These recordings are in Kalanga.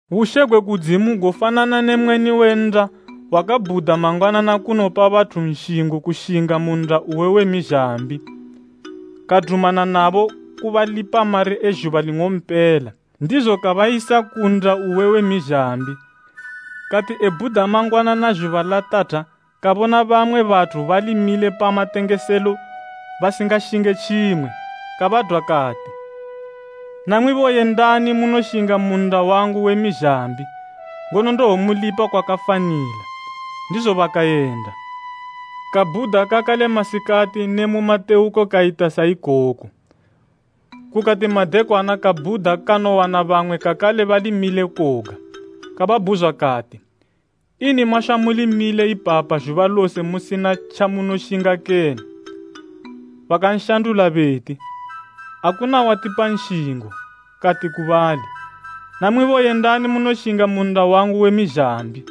“Bushe gwe kudzimu gofanana ne mweni we nnda wakabhuda mangwanana kunopa bathu nshingo kushinga mu nnda uwe we mizhambi. Kadumana nabo kubalipa mari e zhuba ling'ompela, ndizo kabayisa ku nnda uwe we mizhambi. Kati ebhuda mangwanana zhuba latatha kabona bamwe bathu bali mile pa matengeselo basingashinge tjimwe, kabadwa kati, ‘Namwibo yendani munoshinga mu nnda wangu we mizhambi, ngono ndowomulipa kwakafanila.’ Ndizo bakayenda. Kabhuda kakale masikati ne mu matewuko kayita sa ikoko. Kukati madekwana kabhuda kanowana bamwe kakale bali mile koga. Kababhuzwa kati, ‘Ini mashwa muli mile ipapa zhuba lose musina tjamunoshinga kene?’ Bakanshandula beti, ‘Akuna watipa nshingo.’ Kati ku bali, ‘Namwibo yendani munoshinga mu nnda wangu we mizhambi.’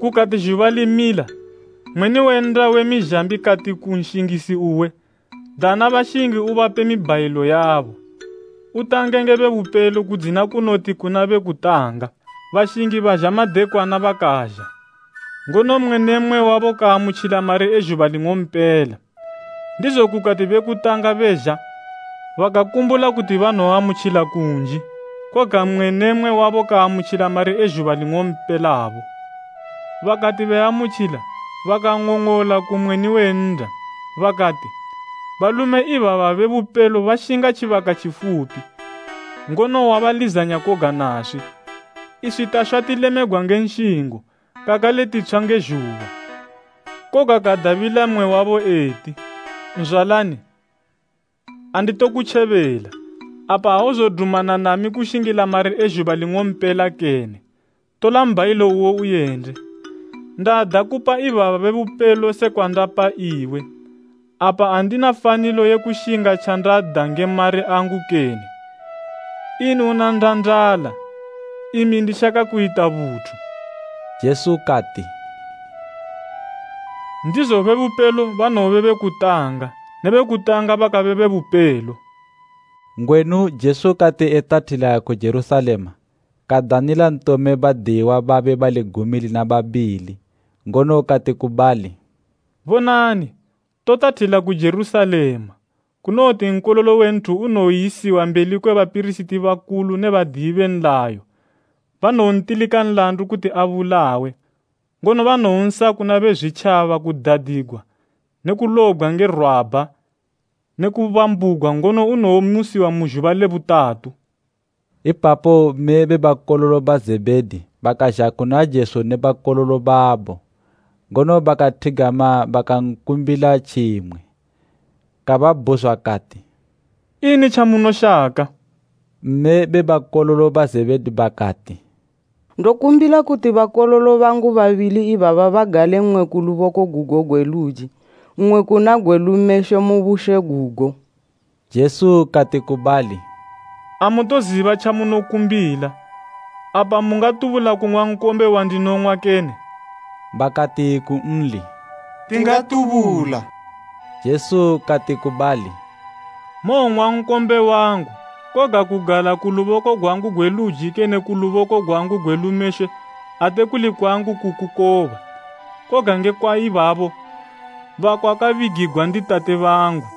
“Kukati zhuba limila, mweni we nnda we mizhambi kati ku nshingisi uwe, ‘Dana bashingi ubape mibhayilo yabo, utange nge be bupelo kudzina kunoti kuna be kutanga.’ Bashingi bazha madekwana bakazha, ngono mmwe ne mmwe wabo kaamutjila mari e zhuba ling'ompela. Ndizo kukati be kutanga bezha bakakumbula kuti banowoamutjila kunji. Koga mmwe ne mmwe wabo kaamutjila mari e zhuba ling'ompelabo. Bakati beaamutjila, bakang'ong'ola ku mweni we nnda, bakati, ‘Balume ibaba be bupelo bashinga tjibaka tjifupi, ngono wabalizanya koga naswi, iswi tashwa tilemegwa nge nshingo kakale titshwa nge zhuba.’ “Koga kadabila mmwe wabo eti, ‘Nzwalani, anditokutjebela. Apa auzodumana nami kushingila mari e zhuba ling'ompela kene? Tola mbhayilo uwo uyende. Ndada kupa ibaba be bupelo sekwa ndapa iwe. Apa andina fanilo ye kushinga tjandada nge mari angu kene? Ini una ndandala, imi ndishaka kuyita buthu?’” Jesu kati, “Ndizo be bupelo banowobe be kutanga ne be kutanga bakabe be bupelo.” Ngwenu Jesu kati etathila ku Jerusalema kadanila ntome badiyiwa babe bali gumi lina babili, ngono kati ku bali, “Bonani, totathila ku Jerusalema, kunowoti Nkololo we Nthu kayisiwa mbeli kwe bapirisiti bakulu ne badiyi be nlayo, kwabanowontilika nlandu kuti abulawe, ngono banowonsa kuna Bezwitjaba kudadigwa ne kulobgwa nge rwabha ne kubambugwa ngono unowomusiwa mu zhuba le butatu.” Ipapo mme be bakololo ba Zebhedi bakazha kuna Jesu ne bakololo babo, ngono bakathigama bakankumbila tjimwe. Kababhuzwa kati, “Ini tjamunoshaka?” Mme be bakololo ba Zebhedi bakati, “Ndokumbila kuti bakololo bangu babili ibaba bagale mmwe ku luboko gugo gwe luji, mmwe kuna gwe lumeshwe mu bushe gugo.” Jesu kati ku bali, “Amutoziba tjamunokumbila. Apa mungatubula kung'wa nkombe wandinowong'wa kene?” Bakati kunli, “Tingatubula.” Jesu kati ku bali, “Mowong'wa nkombe wangu koga kugala ku luboko gwangu gwe luji kene ku luboko gwangu gwe lumeshwe ate kuli kwangu kukukoba, koga ngekwa ibabo bakwakabigigwa ndi Tate bangu.”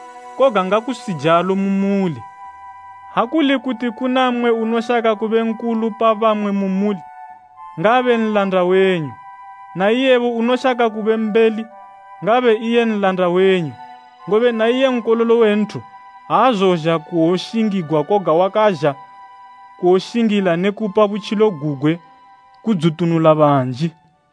Koga ngakusijalo mu muli. Ha kuli kuti kuna mmwe unoshaka kube nkulu pa bamwe mu muli, ngaabe nlanda wenyu, na iyebo unoshaka kube mbeli, ngaabe iye nlanda wenyu. Ngobe na iye Nkololo we Nthu aazozha kuwoshingigwa koga wakazha kuwoshingila ne kupa butjilo gugwe kudzitunula banji.”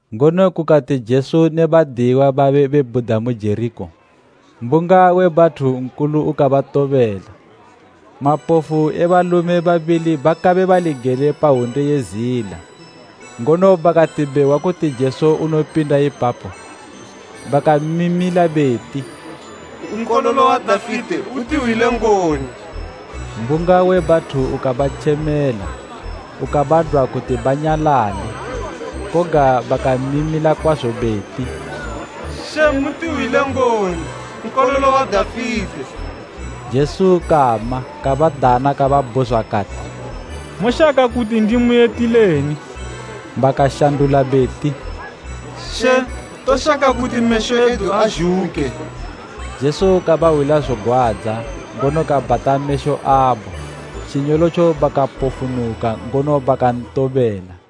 Ngono kukati Jesu ne badiyiwa babe bebhuda mu Jerikho mbunga we bathu nkulu ukabatobela, mapofu e balume babili bakabe bali gele pa hwunde ye zila, ngono bakati behwa kuti Jesu unopinda ipapo bakamimila beti, “Nkololo wa Dafite utihwile ngoni!” Mbunga we bathu ukabatjemela ukabadwa kuti banyalale, koga bakamimila kwazo beti “She mutihwile ngoni, Nkololo wa Dafite!” Jesu kama kabadana kababhuzwa kati, “Moshaka kuti ndimuyitileni?” Bakashandula beti, “She, toshaka kuti mesho edu azhuke.” Jesu kabahwila zogwadza, ngono kabhata mesho abo. Tjinyolotjo bakapofunuka, ngono bakantobela.